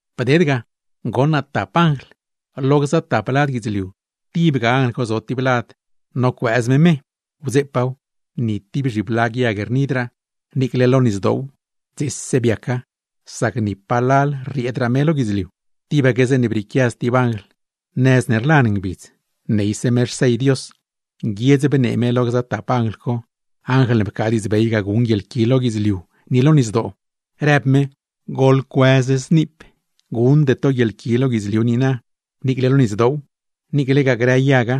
Bded ga, goṉ naa tap anjl. Lo gza tap lad guidzliu, tibga anjl co zo tib lad nocuëëz me me. Wdzeepaaw, per ni tib zhiblag yag rnidraa, niicle lo nisdoow dzese biaca; sac ni palal rrieedraa me lo guidzliu. Tibaque zeeṉe brieequia stib anjl nëz ne rlan ngbidz, neyse me xsell Dios; nguiedz bnee me lo gza tap anjl co (anjl ne pcaa diidzbey ga guṉ guieḻqui lo guidzliu ni lo nisdoo) rëb me: ―¡Goḻcuëz zniip! Guṉde to guieḻqui lo guidzliu niina, niicle lo nisdoow, niiclegaa grë yaga;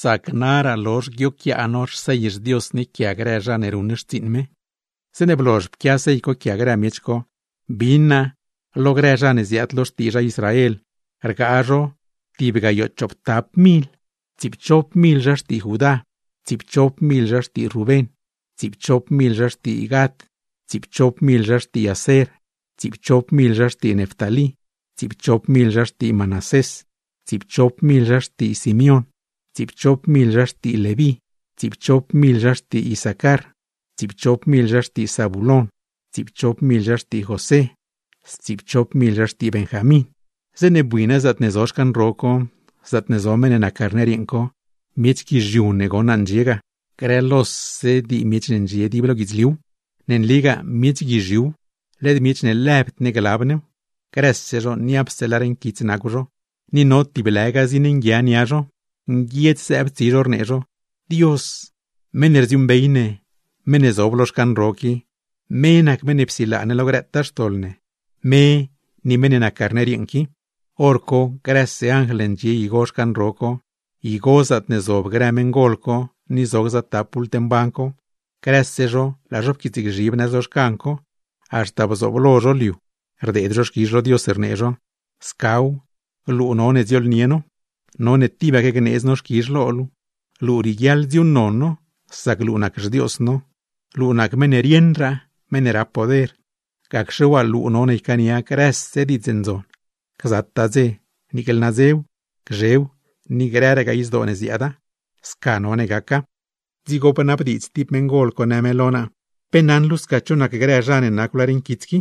sac naraa lozh guioquiaa no xsell xDios ne quia grë zha ne ruṉ xtsiiṉ me. Zeeṉe blozh pquia sell co quia grë miech co, bin naa lo grë zha ne ziaad lo xtii zha Israel, rgaa zho tib gayoo chooptap mil: Tsiipchop mil zha xtii Judá, tsiipchop mil zha xtii Rubén, tsiipchop mil zha xtii Gad, tsiipchop mil zha xtii Aser, tsiipchop mil zha xtii Neftalí, tsiipchop mil zha xtii Manasés, tsiipchop mil zha xtii Simeón, tsiipchop mil zha xtii Leví, tsiipchop mil zha xtii Isacar, tsiipchop mil zha xtii José, stsiipchop mil zha xtii Benjamín. Zeeṉe bui naa zaatne zo xcan ro co, zaatne zo meṉ ne nac Carner yeeṉ co, miech guizhiu ne goṉ naa ndxie ga; grë lose dii miech ne ndxie dib lo guidzliuw. Ne nligaa miech guizhiuw, led miech ne lëbd ne glab new; grëse zho niapse lar nquits nacw zho, ni no tiblëga zin nguia nia zho; nguiedz zëëb tsi zho, rnee zho: Dios, meṉ ne rdziuuṉbey ne, meṉ ne zob lo xcan ro qui, me nac meṉ ne psilaa ne lo grëtaa xtoḻ ne; me ni meṉ ne nac Carner yeeṉ qui. Horco grëse anjl ne ndxie igo xcan ro co, igo zaatne zob grë meṉgol co, ni zo gza tap bult mban co; grëse zho laa zho pquiitsgzhib nëz lo xcan co, haxta bzooblo zho lo liu, rdeed zho xquizh lo Dios rnee zho: ¡Scaw! Luu none dziooḻnie no, none tibaque gneedz no xquizh lo luu, luu rieguiaḻ dziuuṉnon no; sac luu nac xDios no. Luu nac nac meṉ ne rieṉraa, meṉ ne rap poder; gacxe waa luu none ycaania grëse diidz ndzon, gzataa dze, niicle nadzew, gzhew, ni grëragaa izdoo ne ziaada. ¡Sca none gaca! Dzigo bnabdiidz tib meṉgol co, në me lo naa: ―¿Pe naṉ luu sca cho nac grë zha ne nacw lar nquits qui?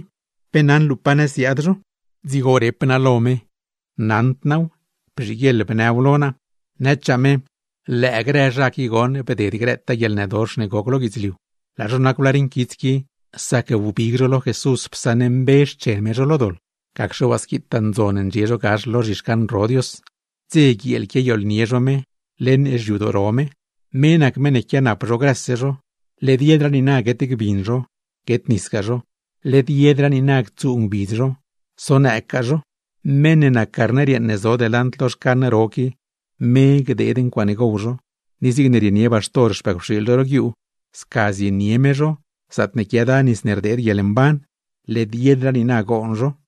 ¿Pe naṉ luu pa nëz ziaad zho? Dzigo rep naa lo me: ―Naṉd naaw. Bzhiguieḻ bnëw lo naa. Nëchaa me: ―Lëë grë zha qui goṉ bded grëtaa guieḻnëdox ne goc lo guidzliu. Laa zho nacw lar nquits qui, sac wbig zho lo Jesús psaṉmbe xchen me zho lo doḻ. Gacxe waa squitaa ndzon ndxie zho gax lo zhixcan ro Dios, dze guieel quiayooḻnie zho me leṉ xyadoo ro me. Me nac meṉ ne quianap zho grëse zho; led yedraa niina guet gbin zho, guet nisgaa zho; led yedraa niina ctsuu ngbidz zho, sonëëggaa zho. Meṉ ne nac Carner yeeṉ ne zo delant lo xcan ro qui, me gdeed ncuaaṉe gow zho, ni zigne rienie baxtor xpëcwxiil zho ro guiuu, sca zienie me zho zaatne quiada nis ne rdeed guieḻmban. Led yedraa niina goon zho.